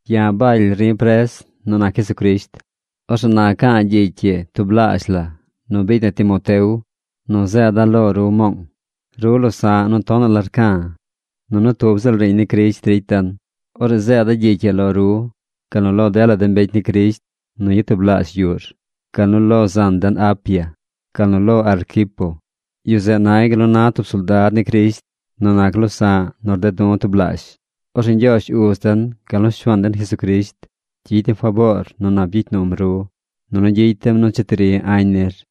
Ya̱ Baly ri̱ pres nu nac Jesucrisht. Orzeꞌ na ca̱a̱ gyicy ii tublaazh la nu biicy na Timoteo nu zeeda̱ lo ru Moong. Ru losa̱ꞌ de̱ nu tonaꞌ la rca̱. Nunu tub ziꞌl riiñ ni Crisht ricy den. Orzeꞌ zeeda̱ gyicy ii lo ru, gal nu lo dela de mbecy ni Crisht nu yatublaazh yuꞌr, gal nu lo zan den Apia, gal nu lo Arquipo. Yu zeꞌ nay gal nu na tub soldad ni Crisht nu nac losa̱ꞌ nu rded du̱ tublaazh. Orzeꞌ Ñgyoozh Uz den gal nu Shuaan den Jesucrisht gyicy dem faboor nu nap gyicy num ru, nunu gyicy dem nu cheti ri añ nir.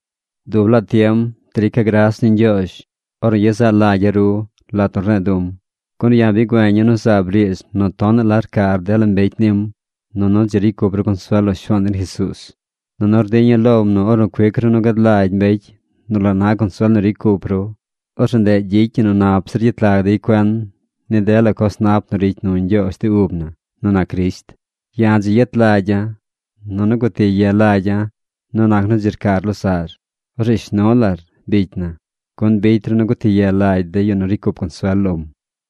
Dub laa tiem drica̱ gras ni Ñgyoozh ornu yezaꞌ lagya̱ ru lat nu rne̱e̱ du̱m, gun ya̱ bi güeña̱ nu zaab riidz nu tonaꞌ la rcar dela mbecy nim nunu dzi ricy cup ru consuel lo Shuaan den Jesuuz. Nunu rdiña̱ lom nu ornu cuic ru nu gad lagy mbecy nu la na consuel ricy cup ru, orzeꞌ ndeꞌ gyicy ñi nu nap zir gyet lag dey cuen ni dela coz nap nu ricy nu Ñgyoozh de ub na nu nac Crisht. Ya̱ dzi yet lagya̱ nunu guti ye lagya̱ nu nac nu dzi rcar losaꞌr. Orzeꞌ shnu lar, bicy na, gun bicy ru nu guti ye lagy de yu nu ricy cup consuel lom.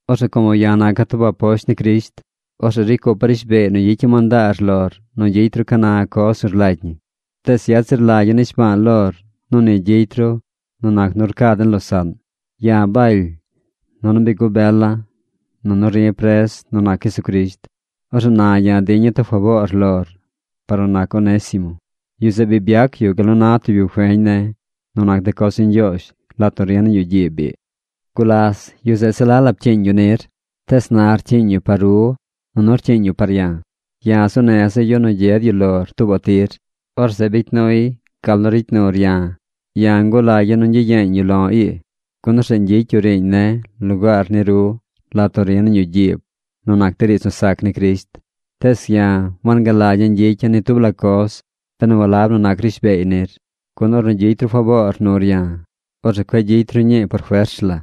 Orzeꞌ como ya̱ naca̱ tub aposht ni Crisht, orzeꞌ ricy cupa̱ rishbeey nu gyicya̱ mandaar lor nu gyicy ru ca na coz nu rlagy ñi. Tees yet zir lagya̱ nishba̱a̱ lor nu ni gyicy ru nu nac nu rca den losaꞌn. Ya̱ Baly. Nunu bi gubela̱. Nunu ri pres nu nac Jesucrisht. Orzeꞌ na ya̱ diña̱ tub faboor lor par nu nac Onésimo. Yu zeꞌ bi byac yu gal nu na tub yu feñ ne̱ nu nac de coz ni Ñgyoozh lat nu ri̱ nañ yuꞌ gyiib ii. Gulas, yu zeꞌ se la la pcyiiñ yu nir, tees na rcyiiñ yu par ru nunu rcyiiñ yu par ya̱. Ya̱ zuu neza̱ yu nu gyed yu lor tuubaꞌ tir. Orzeꞌ bicy nuy gal nu ricy nur ya̱. Ya̱ ngulagya̱ nu ñgyiyeeñ yu lo̱ ii, gun orzeꞌ ñgyicy yu riiñ ne̱ lugaar ni ru lat nu ri̱ nañ yuꞌ gyiib nu nac de riidz nu sac ni Crisht. Tees ya̱ wangalagya̱ ñgyicya̱ ni tub la coz benu walab nu nac rishbeey nir. Gun ornu gyicy ru faboor nur ya̱, orzeꞌ cueꞌ gyicy ru ñii por fers la,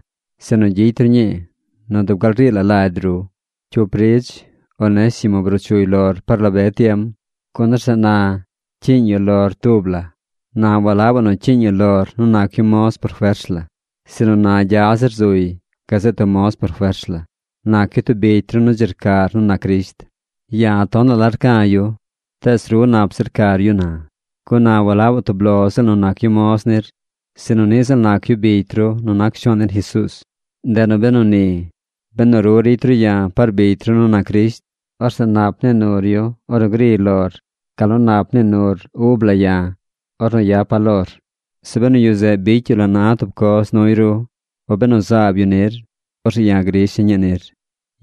sinu gyicy ru ñii nu dub gal rii la lagy ru. Cyup ridz Onésimo bruu chuy lor par la be tiem, gun orzeꞌ na cyiiñ yu lor tub la. Na walabaꞌ nu cyiiñ yu lor nu nac yu moz por fers la, sinu na gya zir zuy gazeꞌ tub moz por fers la. Nac yu tub bicy ru nu dzi rcar nu nac Crisht. Ya̱ tonaꞌ la rca̱ yu. Tees ru nap zir rcar yu na, gun na walab tub lo ziꞌl nu nac yu moz nir, sinu niꞌ ziꞌl nac yu bicy ru nu nac Shuaan den Jesuuz. Ndeꞌ nu beni, benu ru ricy ru ya̱ par bicy ru nu nac Crisht, orzeꞌ nap nii nur yu ornu griy lor gal nu nap nii nur ub la ya̱ ornu yapa̱ lor. Zeꞌ benu yu zeꞌ bicy yu la na tub coz nuy ru, o benu zaab yu nir, orzeꞌ ya̱ grisha̱ ñii nir.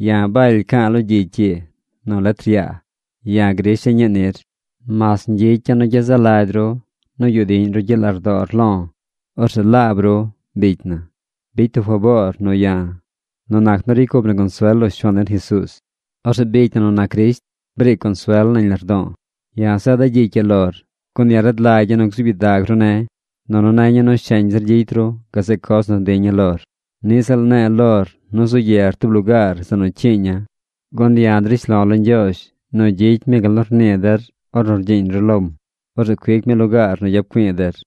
Ya̱ Baly ca̱a̱ lo gyicy ii nu letr yaa: Ya̱ grisha̱ ñii nir. ¡Mas ñgyicya̱ nu gyezaꞌ lagy ru nu yuꞌ diꞌñ ru gyiꞌ lardoor lo̱! Orzeꞌ laab ru, bicy na, bicy tub faboor nu ya̱ nu nac nu ricy cup na consuel lo Shuaan den Jesuuz. Orzeꞌ bicy na nu nac Crisht, briic consuel nañ lardo̱o̱. Ya̱ zeeda̱ gyicy ii lor, gun ya̱ rad lagya̱ nu gzuub gyidag ru ne̱. Nunu neña̱ nu sheñ zir gyicy ru gazeꞌ coz nu diña̱ lor. Niꞌ ziꞌl ne̱e̱ lor nu zu yer tub lugaar zeꞌ nu cyiiña̱, gun ya̱ drish lo̱ lo Ñgyoozh nu gyicy mi gal nu rnii der ornu rgyiiñ ru lom. Orzeꞌ cuic mi lugaar nu yap güi̱i̱ der.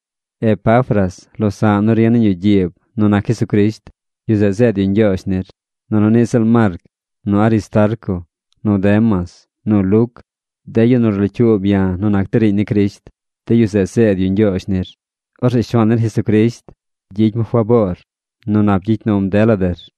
Epafras, losa̱ꞌ nu ri nañ yuꞌ gyiib nu nac Jesucrisht, yu zeꞌ zeed yu ñgyoozh nir. Nunu niꞌ ziꞌl Marc, nu Aristarco, nu Demas, nu Luc, de yu nu rlocyuub ya̱ nu nac de riiñ ni Crisht, de yu zeꞌ zeed yu ñgyoozh nir. Orzeꞌ Shuaan den Jesucrisht gyicy mi faboor nu nap gyicy num der.